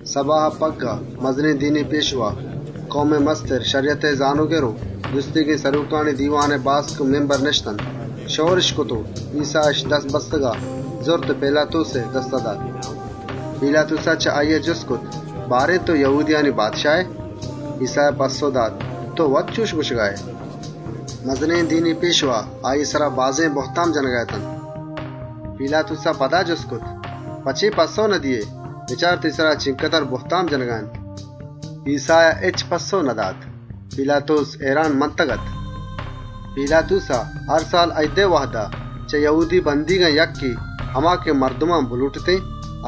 ‏ سَباها پَگّاه، مزنێن دینی پێشوا، کئومئے کماش، شَریَتئے زانۆگر و سرۆکانی دیوانئے سجّهێن باسک همشئور بوتنت و ایسّااِش بست، گِرّان کرت و پیلاتوسئے دستا دات. ‏ پیلاتوسا چه آییا جُست کرت: «تئو یَهودیانی بادشاه ائے؟» ایسّایا پَسّئو دات: «تئو وت گوَشگا ائے.» ‏ مزنێن دینی پێشوا آییئے سرا بازێن بُهتام جنَگا اتنت. ‏ پیلاتوسا پدا جُست کرت: «په چے پَسّئوَ ندئیئے؟ بچار تئیی سرا چینچُک بِڈّ و بُهتام جنَگا اَنت.» ‏ ایسّایا هچ پَسّئو ندات. پیلاتوس هئیران مَنت. ‏ پیلاتوسا، هر سال اییدئے وهدا، چه یَهودی بندیگان یکّے، هما که مردمان بلۆٹتێن،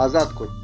آزاتَ کرت. ‏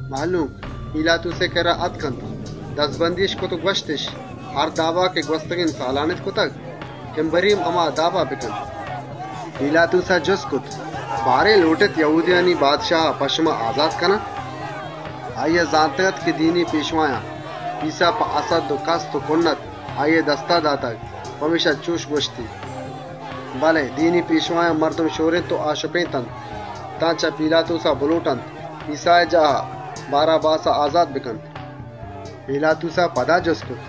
مهلوک، پیلاتوسئے کِرّا آتک، دَزبندی‌اِش کرت و گوَشتِش: «هر دابا که گوَستگێن سالانِت کرتگ، اِمبری هم هما دابا بکن.» ‏ پیلاتوسا جُست کرت: «لۆٹێت یَهودیانی بادشاها په شما آزات بکنان؟» ‏ آییا زانتگ‌اَت که دینی پێشوایان، ایسّا په هَسَدّ و کُنّت آییئے دستا داتگ. پمێشکا چُش گوَشتی. ‏ بله دینی پێشوایان مردم شۆرێنت و آشُپێنتنت تان چه پیلاتوسا بلۆٹنت ایسّائے جاها، باراباسا آزات بکنت. ‏ پیلاتوسا پدا جُست کرت: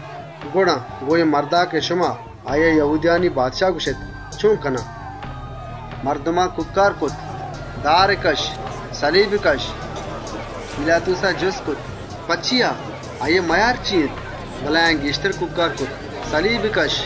«گڑا اے مردا که شما آییا یَهودیانی بادشاهَ گوَشێت، چۆن کنان؟» ‏ مردمان کوکّار کرت: «سَلیبی کَشّ!» ‏ پیلاتوسا جُست کرت: «چیا بارێن؟ مئیاری چی اِنت؟» بله آیان گێشتر کوکّار کرت: «سَلیبی کَشّ!» ‏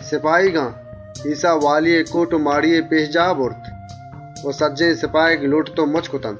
سپاهیگان، ایسّا والیئے کۆٹ و ماڑیئے پێشجاها برت و سپاهیگانی سجّهێن لشکر لۆٹت و مُچّ کرت. ‏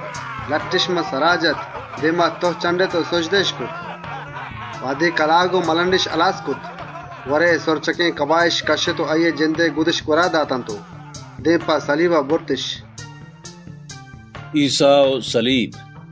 لَٹِّش سرا جت، دێما تُه کرت و سُجده‌اِش کرت. ‏ وهدے کلاگ و مَلنڈِش هلّێنت، گوَرئے جَمورنگێن کَباهِش کَشّت و آییئے جندئے گُدِش پدا گوَرا داتنت. رندا، دێم په سَلیب کَشّگا برتِش. ایسّا و سَلیب ‏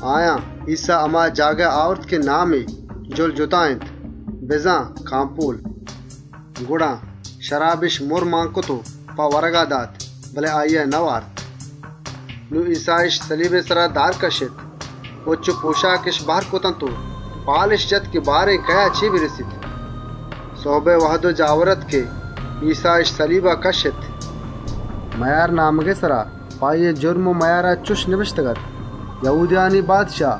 آیان، ایسّا هما جاگها آورت که نامی «جُلْجُتا» بزان «کامپۆل» اِنت. ‏ گڑا، شرابِش مُرّ مان کرت و په ورگا دات، بله ایسّایا نئوارت. ‏ نون سَلیبئے سرا دْرتکِش، پُچّ و پۆشاکِش وت‌مان‌وتا بهر کرتنت و پال جتِش که بارێن کئیا چے رسیت. ‏ سُهبئے وهد اَت که ایسّااِش سَلیب کَشّت. ‏ مئیارنامگئے سرا په آییئے جُرم و مئیارا چُش نبشتگ‌اَت: «یَهودیانی بادشاه.» ‏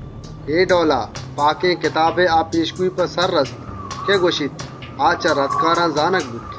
اے ڈئولا، پاکێن کتابئے هما پێشگۆیی سرجم بوت که گوَشیت: آ چه رَدکاران زانگ بوت. ‏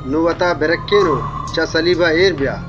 نون وتا برَکّێن و چه سَلیبا اێر آ!» ‏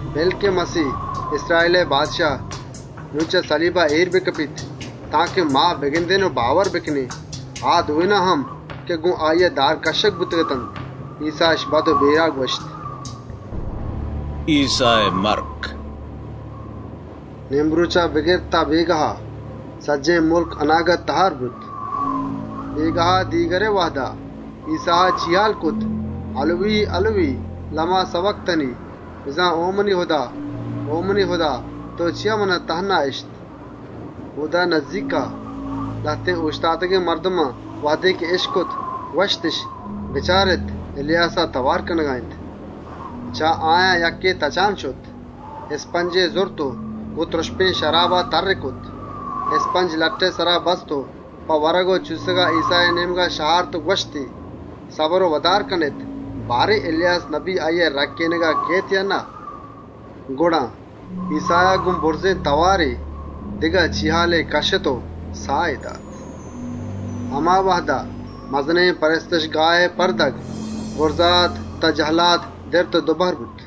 بِلّ که مَسیه، اِسراییلئے بادشاه، نون چه سَلیبا اێر بکپیت تانکه ما بگندێن و باور بکنێن.» آ دوێن هم که گۆن آییا دار کَشّگ بوتگ‌اتنت، ایسّایا بَد و رَد گوَشگا اتنت. ایسّائے مَرک ‏ نێمرۆچا بگر تان بێگاهئے سئیا، سجّهێن مُلک اَناگت تهار بوت. ‏ بێگاهئے ساهت سئیا، ایسّایا چیهال جت: «اِلویی، اِلویی، لِما سَبَکْتَنی؟» (بزان: او منی هُدا، او منی هُدا! تئو چیا منا تهنا اِشت؟) ‏ اۆدا نزّیکا، لهتێن اۆشتاتگێن مردما وهدے اِشکت، گوَشتِش: «بچارێت، اِلیاسا تئوار کنگا اِنت.» ‏ چه آیان یکّے تچانا شت، اِسْپنجے زرت و تْرُپشێن شرابا میسّێنتی. اِسْپنج، دارێئے سرا بست و په چوسّگا ایسّائے نێمگا شهارت و گوَشتی: «سَبر و ودار کنێت، بچارێن بارێن اِلیاس آییئے رَکّێنگا کئیت یا نه؟» ‏ گڑا، ایسّایا بُرزێن تئوارێا چیهال کَشّت و ساه دات. ‏ همے وهدا، مزنێن پرستشگاهئے پرده، بُرزادا بگر تان جهلاد دِرت و دو بهر بوت. ‏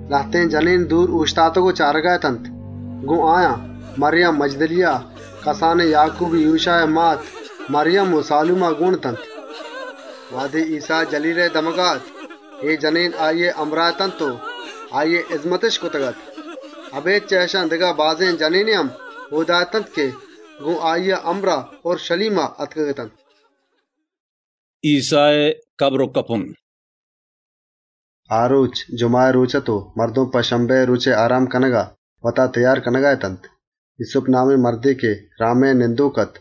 لهتێن جنێن دور اۆشتاتگ و چارگا اَت، گۆن آیان، مَریم مَجْدَلیَه، کسانێن آکوب و یوشائے مات مَریم و سالومه گۆن اتنت. ‏ وهدے ایسّا جَلیلا اَت، اے جنێن آییئے همراه اتنت و آییئے هِزمت و چلۆپگِش کرتگ‌اَت. اَبێد چه اِشان، دگه بازێن جنێنے هم اۆدا اَت که آییئے همراهیا اورْشَلیما آتکگ‌اتنت. ایسّائے کَبر و کپُن ‏ آ رۆچ، جُمَهئے رۆچ اَت و مردم، په شَبَّتئے رۆچئے آرام کنگا، وتا تئیار کنگا اتنت. ‏ ایسُّپ نامێن مردے که اَریماتیائے شهرئے نندۆک اَت،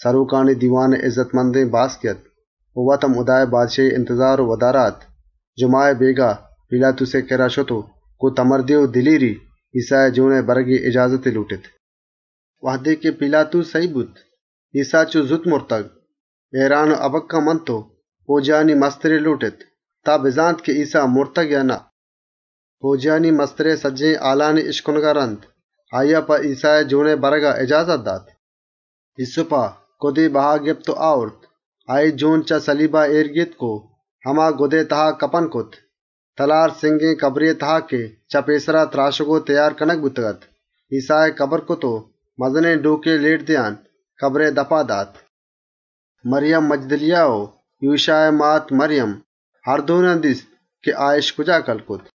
سرۆکانی دیوانئے اِزَّتمندێن باسکے اَت و وت هم هُدائے بادشاهیئے رَهچار و وداریگ اَت. جُمَهئے بێگاها پیلاتوسئے کِرّا شت و گۆن بهادُرّی و دِلێری، ایسّائے جۆنئے برگئے اِجازتی لۆٹت. ‏ وهدے پیلاتوس سَهیگ بوت ایسّا چۆ زوت مرتگ، هئیران و هَبَکَّه مَنت و پئوجیانی مستری لۆٹت تان بزانت که ایسّا مرتگ یا نه؟ ‏ پئوجیانی مسترئے سجّهێن هال و هبرانی اِشکنگا رَند، ایسّائے جۆنئے برگئے اِجازتی دات. ‏ ایسُّپا، گُدے بها گپت و آورت، آییئے جۆن چه سَلیبا اێر گێتک و هما گُدئے تها کپُن کرت. کَبرێئے تها که چه پێسرا چه تلارا تْراشگ و تئیار کنگ بوتگ‌اَت، ایسّایی کَبر کرت و مزنێن ڈۆکے لێٹ دئیانا کَبرئے دپا اێر کرت. ‏ مَریم مَجْدَلیَه و یوشائے مات مَریم، هر دوێنان دیست که آاِش کجا کَلّ کرت.